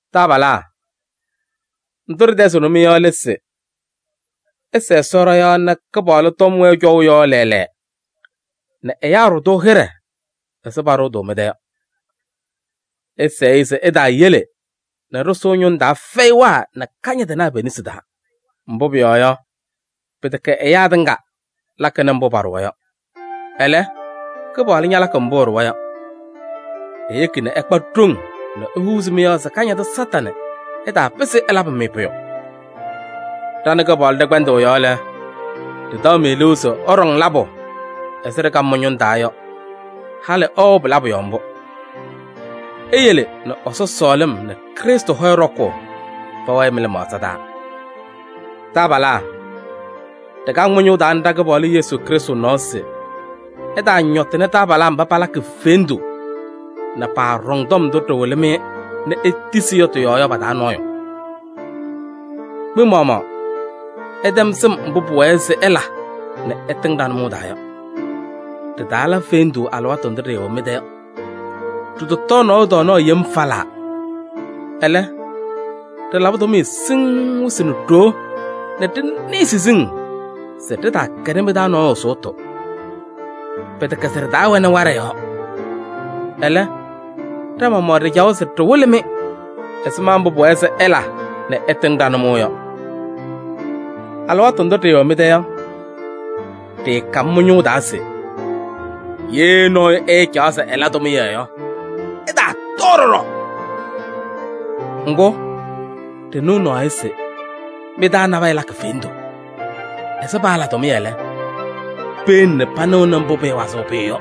Taabalaa! Ndʋ ɖɩtɛzɩɣnɩ-mɩ yɔ lɛ se: ɩsɛɛ Ɛsɔ ɖɔ-yɔɔ nɛ Kɩpaɣlʋ tɔm wɛɛ cɔʋ yɔɔ lɛɛlɛɛ nɛ ɛyaa ɖʋ-tʋ hɩɖɛ ɛzɩ paɖʋʋ-tʋ mɩ-tɛ yɔ. Ɩsɛɛ-ɩ se ɛtaayele nɛ ɖɩsʋʋ ñʋŋ taa fɛyɩwaa nɛ kañadɩnaa pe-nesi taa. Mbʋ pʋyɔɔ yɔ, pɩtɛkɛ ɛyaa tɩŋa lakɩnɩ mbʋ paɖʋwa yɔ. Ɛlɛ, Kɩpaɣlʋ ñalakɩ mbʋ ɛɖʋwa yɔ. Eyeki nɛ ɩkpa ɖoŋ nɛ ehuuzi mɩ-yɔɔ se Kañadʋ Satanɩ ɛtaapɩzɩ ɛlabɩ-mɩ pʋyʋ. Ɖa nɛ Kɩpaɣlʋ ɖɛ-kpɛndʋʋ yɔɔ lɛ, ɖɩtaɣ-mɩ liu se ɩɖaɣnɩ labʋ ɛzɩ ɖɩkam mɩ-ñʋʋ taa yɔ, halɩ ɩwɛɣ pɩ-labʋ yɔɔ mbʋ. Eyele nɛ Ɛsɔ sɔɔlɩm nɛ Krɩstʋ hɔyɛ ɖɔkʋʋ pɛwɛɛ mɩ-lɩmaɣza taa. Taabalaa! Ɖɩkaŋ mɩ-ñʋʋ taa nɛ ɖa-Kɩpaɣlʋ Yesu Krɩstʋ nɔɔ se ɩtaañɔtɩnɩ taabalaa mba palakɩ fendu nɛ paaɖɔŋ tɔm ndʋ ɖɩwɩlɩ-mɩ nɛ itisi yɔ tɩ-yɔɔ yɔ pa-taa nɔɔyʋ. Mɩ-maɣmaɣ, ɩtɛm sɩm mbʋ pʋwɛɛ se ɩla nɛ ɩtɩŋ ɖa-nʋmɔʋ taa yɔ: ɖɩtaala fendu alɩwaatʋ ndʋ ɖɩɩwɛ mɩ-tɛ yɔ. Ɖɩtɔtɔɔ nɔɔyʋ tɔɔnaɣ yem falaa. Ɛlɛ, ɖɩlabɩ tʋmɩyɛ siŋŋ wɩsɩ nɛ ɖoo nɛ ɖɩnɩɩ siziŋ se ɖɩtaakɛnɩ mɩ-taa nɔɔyʋ sʋʋtʋ. Pɩtɛkɛ se ɖɩtaawɛnɩ waɖɛ yɔɔ. Ɛlɛ, ɖa-maɣmaɣ ɖɩcawa se ɖɩwɩlɩ-mɩ ɛzɩma mbʋ pʋwɛɛ se ɩla nɛ ɩtɩŋ ɖa-nʋmɔʋ yɔ. Alɩwaatʋ ndʋ ɖɩɩwɛ mɩ-tɛ yɔ, ɖɩɩkam mɩ-ñʋʋ taa se: “Ye nɔɔyʋ ɛɛcaɣ se ɛla tʋmɩyɛ yɔ, ɛtaatɔɔ ɖɔɖɔ.” Ŋgʋ, ɖɩnɩɣ naɣ yɔ se mɩ-taa nabɛyɛ lakɩ fendu, ɛzɩ paala tʋmɩyɛ lɛ, peyele panɩɣnɩ mbʋ pɩɩwazɩɣ pʋyʋ yɔ.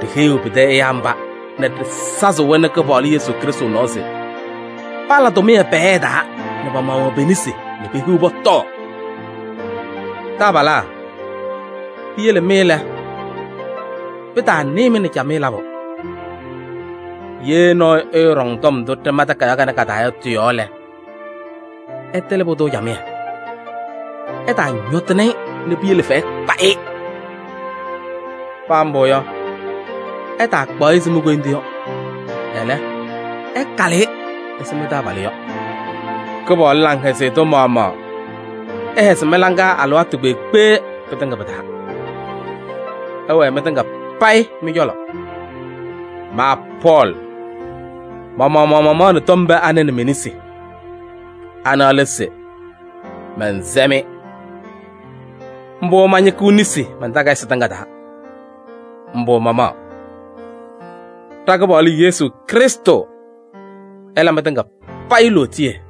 Ɖiheyiɣ pɩtɛ ɛyaa mba nɛ ɖɩsazɩɣ-wɛ nɛ Kɩpaɣlʋ Yesu Krɩstʋ nɔɔ se pala tʋmɩyɛ pɛɛyɛɛ taa nɛ pa-maɣmaɣ pe-nesi nɛ pehiɣ pɔtɔɔ. Taabalaa! Piyele mɩ lɛ, pɩtaanɩɩ-mɩ nɛ camɩyɛ labʋ. Ye nɔɔyʋ ɛɛɖɔŋ tɔm ndʋ ɖɩma takayaɣ kanɛ ka-taa yɔ tɩ-yɔɔ lɛ, ɩtɩlɩ pʋdʋ camɩyɛ, ɩtaañɔtɩnɩ-ɩ nɛ piyele fɛyɛ kpa-ɩ. Paa mbʋ yɔ, ɩtaakpaɣ-ɩ ɛzɩ mi-koyindu yɔ, ɛlɛ, ɩkalɩ-ɩ ɛzɩ mɩ-taabalʋ yɔ. Kɩpaɣlʋ laŋhɛzɩyɛ tʋ maɣmaɣ ɛhɛzɩ mɩ-laŋa alɩwaatʋ kpeekpe pɩtɩŋa pɩ-taa! Ɛwɛɛ mɩtɩŋa payɩ mɩ-cɔlɔ! Ma Pɔɔlɩ, ma-maɣmaɣ mamaɣnɩ tɔm pee anɛ nɛ me-nesi. Ana lɛ se: mɛnsɛ-mɩ. Mbʋ mañɩkɩɣ nesi man-takayɩsɩ tɩŋa taa. Mbʋ mamaɣ. Ɖa-Kɩpaɣlʋ Yesu Krɩstʋ ɛla mɩtɩŋa payɩ lootiye!